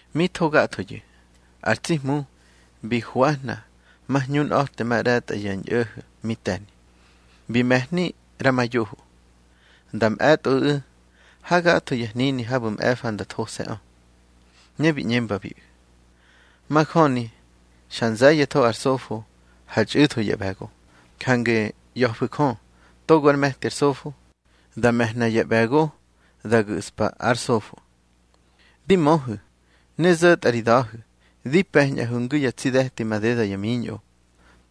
Mi tho gathoyu̱, ar tsi Hmu bi hwahna ma hñunꞌa̱te ma ꞌre̱tꞌa ya ñꞌo̱ho̱ mi te̱ni. Bi me̱hni ꞌra ma yoho, nda mꞌe̱tꞌoꞌu̱ ha gatho ya hnini habu̱ mꞌe̱fa nda those̱ꞌö. Ne bi ꞌñembabiꞌu̱: —Majöni xa nze̱ye̱tho ar sofo, ha txꞌu̱tho ya ꞌbe̱go. Jange ꞌya̱fu̱ Jö togo ár me̱ti ar sofo, da me̱hna ya ꞌbe̱go da gu̱ꞌspa ár sofo. Di möhu̱ ne zo̱tꞌa ri da̱hu̱, di pe̱ñꞌahu̱ ngu ya tsi de̱ti madeda ya miñꞌo.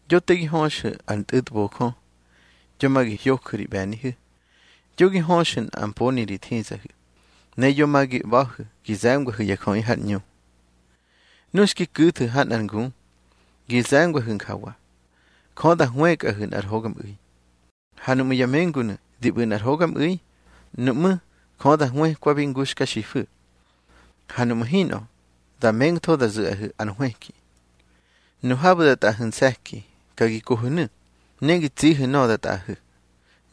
Yo te gi höxu̱ ar ntꞌu̱tbojö, yo ma gi hyoju̱ ri ꞌbe̱nihu̱, yo gi höxu̱ nꞌa mponi ri thizahu̱. Ne yo ma gi ꞌba̱hu̱ gi ze̱ngwahu̱ ya jöꞌi har ꞌñu. Nu xki ku̱thu̱ ha nꞌar ngu, gi ze̱ngwahu̱ njawa: Jö da hwëkꞌahu̱ nꞌar hogamꞌu̱i. Ha nuꞌmu̱ ya mengunu̱ di ꞌbu̱ nꞌar hogamꞌu̱i, nuꞌmú̱ Jö da hwëkwabi ngu xka xifu̱. Ha nuꞌmu̱ hinꞌö, da mengtho da zu̱ꞌahu̱ ar hwëki. Nu habu̱ da tꞌaꞌahu̱ nse̱ki, ka gi kohu̱nu̱, ne gi tsihu̱ nöꞌö da tꞌaꞌahu̱.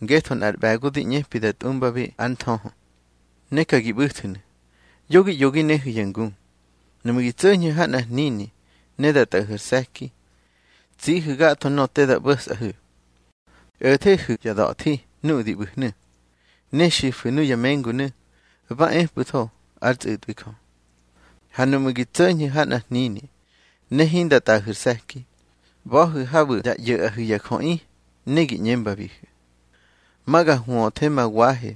Ngetho nꞌar ꞌbe̱go di ꞌñepi da tꞌumbabi ár nthöhö. Ne ka gi ꞌbu̱thu̱nu̱, yo gi ꞌyo gi nehu̱ ya ngu. Nuꞌmu̱ gi tso̱ñhu̱ ha nꞌar hnini ne da tꞌaꞌahu̱ ar se̱ki, tsihu̱ gatho nöꞌö te da ꞌbo̱sꞌahu̱. O̱thehu̱ ya da̱thi nuꞌu̱ di ꞌbu̱hnu̱, ne xifu̱ nuya mengunu̱, ba epꞌu̱tho ár tsꞌu̱tꞌwi Jö. Ha nuꞌmu̱ gi tso̱ñhu̱ ha nꞌar hnini ne hinda tꞌaꞌahu̱ ar se̱ki, ꞌba̱hu̱ habu̱ da ꞌyo̱ꞌahu̱ ya jöꞌi, ne gi ꞌñembabihu̱: Ma ga hwöthe ma wahe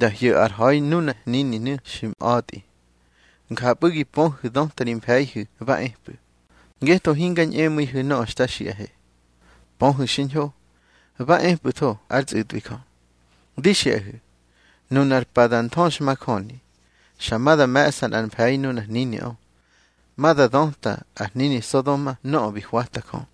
da hyo̱ ár ha̱i nuna hnininu̱ xi mꞌa̱tꞌi. Njapꞌu̱ gi pöhu̱ döta ri mfe̱ihu̱ ba epꞌu̱, ngetho hinga ñꞌemu̱ihu̱ nöꞌö xta xiꞌahe. Pöhu̱ xiñho, ba epꞌu̱tho ár tsꞌu̱tꞌwi Jö. Di xiꞌahu̱, nunar pa da nthöxmajöni, xa ma da me̱ꞌsa nꞌar mfe̱i nunar hniniꞌö, ma da döta ar hnini Sodoma nöꞌö bi hwata Jö.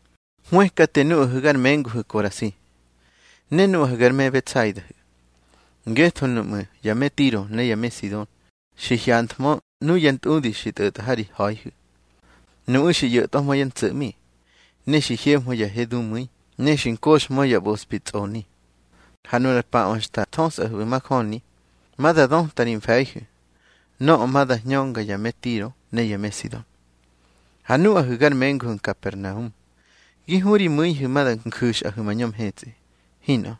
Hwëkate nuꞌahu̱ gar menguhu̱ Korasi, ne nuꞌahu̱ gar me Betsaidahu̱. Ngetho nuꞌmu̱ ya me Tiro ne ya me Sidon xi hyanthmö nuya ntꞌudi xi tꞌo̱tꞌa ha ri ha̱ihu̱, nuꞌu̱ xi ꞌyo̱tꞌwahmö yá ntso̱ꞌmi. Ne xi hyehmö ya he dumu̱i, ne xi nkoxhmö ya ꞌbospi tsꞌoni. Ha nunar paꞌö xta thöspꞌahu̱ majöni, ma da döta ri mfe̱ihu̱ nöꞌö ma da hñönga ya me Tiro ne ya me Sidon. Ha nuꞌahu̱ gar menguhu̱ Nkapernaum, gi hu ri mu̱ihu̱ ma da nju̱xꞌahu̱ mañö mhetsꞌi. Hinꞌö.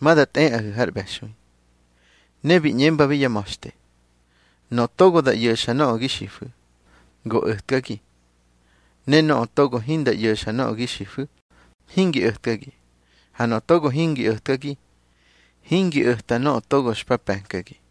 Ma da tꞌeꞌahu̱ har ꞌbe̱xui. Ne bi ꞌñembabi yá ma̱xte: —Nöꞌö togo da ꞌyo̱xa nöꞌö gi xifu̱, go o̱tkagi. Ne nöꞌö togo hinda ꞌyo̱xa nöꞌö gi xifu̱, hingi o̱tkagi. Ha nöꞌö togo hingi o̱tkagi, hingi o̱ta nöꞌö togo xpa pe̱nkagi.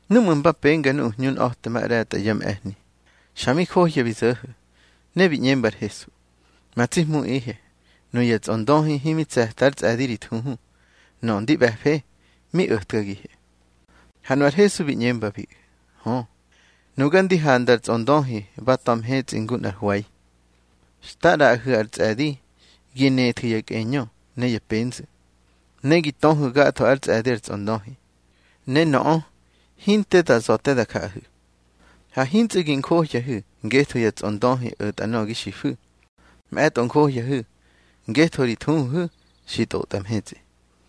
Núꞌmu̱ mba penga nuꞌu̱ hñunꞌa̱te ma ꞌre̱tꞌa ya mꞌe̱hni, xa mi johya bi zo̱ho̱, ne bi ꞌñemba ar Hesu: —Ma tsi Hmuꞌihe, nuya tsꞌondöhi himi tse̱ta ár tsꞌe̱di ri thuhu. Nöꞌö ndi ꞌbe̱fe, mi o̱tkagihe. Ha nu ar Hesu bi ꞌñembabiꞌu̱: —Hö. Nuga ndi handa ar tsꞌondöhi ba ta̱ mhetsꞌi ngu nꞌar hwe̱i. Xta ꞌraꞌahu̱ ar tsꞌe̱di gi nethu̱ ya kꞌeñö ne ya penzu̱, ne gi töhu̱ gatho ár tsꞌe̱di ar tsꞌondöhi, ne nöꞌö hinte da za̱ te da jaꞌahu̱. Ha hintsꞌu̱ gi njohyahu̱ ngetho ya tsꞌondöhi o̱tꞌa nöꞌö gi xifu̱. Mꞌe̱tꞌo njohyahu̱ ngetho ri thuhuhu̱ xi ntꞌotꞌa mhetsꞌi.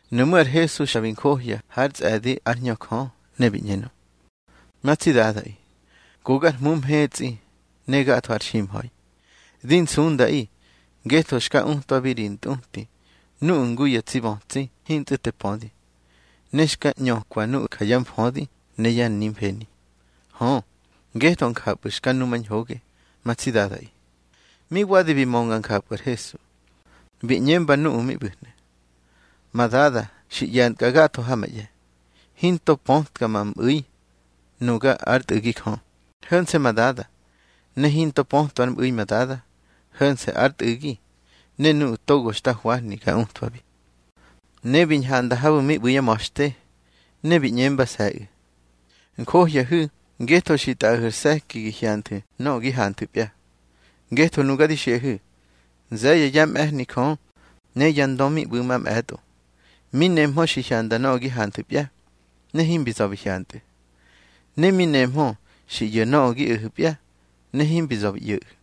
Nuꞌmú̱ ar Hesu xa bi njohya hár tsꞌe̱di ár Hñö Jö, ne bi ꞌñenö: —Ma tsi Dadaꞌi, go gar Hmu mhetsꞌi ne gatho har ximha̱i. Di nsundaꞌi ngetho xka utwabi ri ntꞌuti nuꞌu̱ ngu ya tsi bötsi hintsꞌu̱ te pödi, ne xka ꞌñökwa nuꞌu̱ ja yá mfödi ne ya nimfeni. Hö, ngetho njapꞌu̱ xka numañhoge, ma tsi Dadaꞌi. Mi wadi bi mönga njapꞌu̱ ar Hesu, bi ꞌñemba nuꞌu̱ mi ꞌbu̱hnu̱: —Ma Dada xi ꞌye̱ntkꞌa gatho ha ma ꞌye̱. Hinto pötka ma mꞌu̱i, nuga ár Tꞌu̱gi Jö, ho̱nse̱ ma Dada. Ne hinto pötwa ár mꞌu̱i ma Dada, ho̱nse̱ ár Tꞌu̱gi ne nuꞌu̱ togo xta hwahni ga utwabi. Ne bi ñhanda habu̱ mi ꞌbu̱ yá ma̱xte, ne bi ꞌñembase̱ꞌu̱: —Njohyahu̱ ngetho xi tꞌaꞌahu̱ ar se̱ki gi hyanthu̱ nöꞌö gi hanthu̱pya. Ngetho nuga di xiꞌahu̱, nze̱ye̱ yá mꞌe̱hni Jö ne ya ndö mi ꞌbu̱ mamꞌe̱tꞌo, mi nehmö xi hyanda nöꞌö gi hanthu̱pya, ne himbi za̱ bi hyantꞌu̱. Ne mi nehmö xi ꞌyo̱ nöꞌö gi o̱hu̱pya, ne himbi za̱ bi ꞌyo̱ꞌu̱.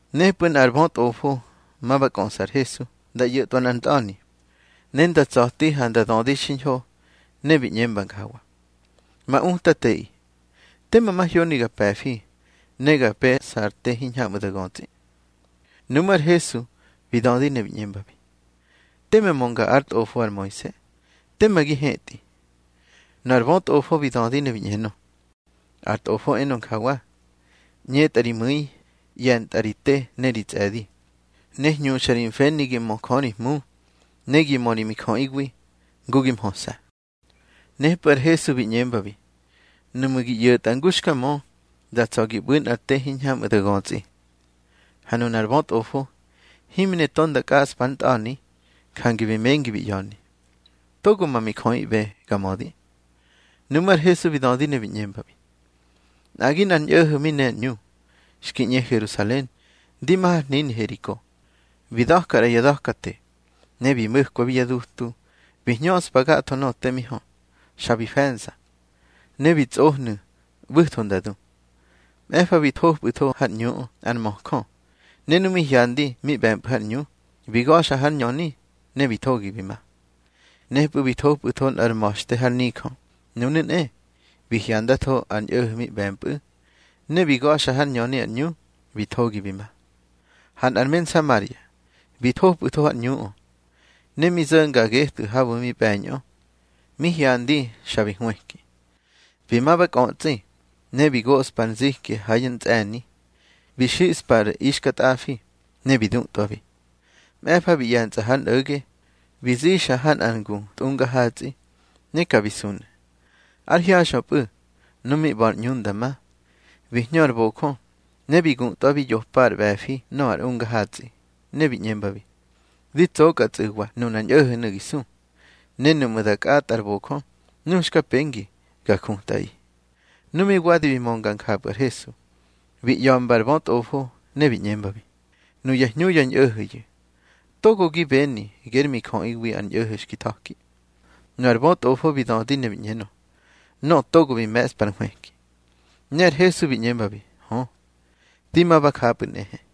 Nepꞌu̱ nꞌar bötꞌofo ma ba kꞌöꞌsa ar Hesu nda ꞌyo̱tꞌwa nꞌar ntꞌa̱ni, ne nda tsa̱ti ha nda dödi xiñho, ne bi ꞌñemba njawa: —Ma Utateꞌi, tema mahyoni ga pe̱fi ne ga pe̱ꞌsa ar te hiñhamꞌu̱ da götsꞌi. Nuꞌmú̱ ar Hesu bi dödi ne bi ꞌñembabi: —Teme mönga ár tꞌofo ar Moise. Tema gi hetꞌi. Nu ar bötꞌofo bi dödi ne bi ꞌñenö: —Ar tꞌofo enö njawa: ꞌÑetꞌa ri mu̱i, ꞌye̱ntꞌa ri te ne ri tsꞌe̱di, ne hñuxa ri mfeni gi mö Jö ri Hmu, ne gi mö ri mijöꞌiwi ngu gi mhöse̱. Nepꞌu̱ ar Hesu bi ꞌñembabi: —Nuꞌmu̱ gi ꞌyo̱tꞌa ngu xka mö, da tsa̱ gi ꞌbu̱ nꞌar te hiñhamꞌu̱ da götsꞌi. Ha nunar bötꞌofo himi ne to nda kꞌaꞌspa ár ntꞌa̱ni. Jange bi mengi bi ꞌya̱ni: —Togo ma mijöꞌiꞌbe ga mödi. Nuꞌmú̱ ar Hesu bi dödi ne bi ꞌñembabi: —Nꞌagi nꞌar ñꞌo̱ho̱ mi ne ar ꞌñu, xki ꞌñe Herusalen ndi ma har hnini Heriko. Bi da̱ka ꞌra ya da̱kate, ne bi mo̱kwabi yá dutu bi hñöꞌspa gatho nöꞌö te mi hö. Xa bi fe̱nza, ne bi tsꞌohnu̱ ꞌbu̱tho nda du. Mꞌe̱fa bi thopꞌu̱tho har ꞌñuꞌö nꞌar möjö, ne nu mi hyandi mi ꞌbe̱mpꞌu̱ har ꞌñu, bi ga̱xa hár ñöni, ne bi thogi bi ma. Nepꞌu̱ bi thopꞌu̱tho nꞌar ma̱xte har nijö. Nunu̱ nꞌe, bi hyandatho ar ñꞌo̱ho̱ mi ꞌbe̱mpꞌu̱, ne bi ga̱xa hár ñöni ar ꞌñu, bi thogi bi ma. Ha nꞌar me Nsamaria bi thopꞌu̱tho har ꞌñuꞌö. Ne mi zo̱nga getꞌu̱ habu̱ mi ꞌbe̱ñꞌö, mi hyandi, xa bi hwëki. Bi ma ba kꞌötsꞌi, ne bi goꞌspa ar nziki ha yá ntsꞌe̱ni, bi xiꞌspa ar ixkatꞌafi, ne bi dutꞌwabi. Mꞌe̱fa bi ꞌye̱ntsꞌa hár nꞌo̱ge, bi zixa ha nꞌar ngu tꞌungar hatsꞌi, ne ka bi sunu̱. Ár hyaxꞌöpꞌu̱, nu mi ꞌba̱ ar ꞌñu nda ma, bi hñö ar bojö, ne bi gutꞌwabi yopa ar ꞌbe̱fi nöꞌö ar unga hatsꞌi. Ne bi ꞌñembabi: Di tsokꞌatsꞌu̱wa nunar ñꞌo̱ho̱nu̱ gi su, ne nuꞌmu̱ da kꞌatꞌa ar bojö, nu xka pengi ga jutꞌaꞌi. Nu mi wadi bi mönga njapꞌu̱ ar Hesu, bi ꞌya̱mba ar bötꞌofo, ne bi ꞌñembabi: —Nuya hñu ya ñꞌo̱ho̱yu̱, togo gi beni ger mijöꞌiwi ar ñꞌo̱ho̱ xki tha̱ki. Nu ar bötꞌofo bi dödi ne bi ꞌñenö: —Nöꞌö togo bi me̱ꞌspa ar nhwëki. Ne ar Hesu bi ꞌñembabi: —Hö. Di ma ba japꞌu̱ nꞌehe.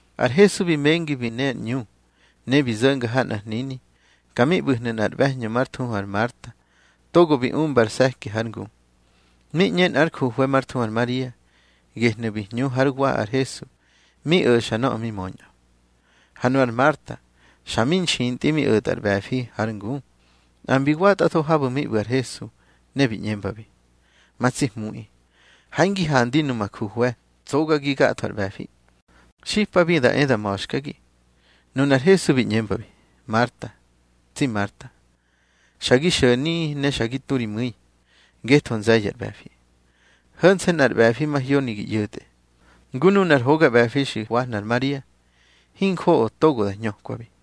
Ar Hesu bi mengi bi ne ar ꞌñu, ne bi zo̱nga ha nꞌar hnini. Ka mi ꞌbu̱hnu̱ nꞌar ꞌbe̱hñö már thuhu ar Marta, togo bi umba ar se̱ki hár ngu. Mi ꞌñe nꞌár juhwe̱ már thuhu ar Maria, gehnu̱ bi hñu hár wa ar Hesu mi o̱xa nöꞌö mi möñꞌö. Ha nu ar Marta xa mi nxintꞌi mi o̱tꞌa ar ꞌbe̱fi har ngu. Nꞌa mbi watꞌatho habu̱ mi ꞌbu̱ ar Hesu, ne bi ꞌñembabi: —Ma tsi Hmuꞌi, ha hingi handi numa juhwe̱ tsogagi gatho ar ꞌbe̱fi. Xipabi da e da ma̱xkagi. Nunar Hesu bi ꞌñembabi: —Marta, tsi Marta, xa gi xo̱ni, ne xa gi tu ri mu̱i, ngetho nze̱ye̱ ar ꞌbe̱fi. Ho̱nse̱ nꞌar ꞌbe̱fi mahyoni gi ꞌyo̱tꞌe, ngu nunar hoga ꞌbe̱fi xi hwahna ar Maria. Hinjoꞌo togo da hñökwabi.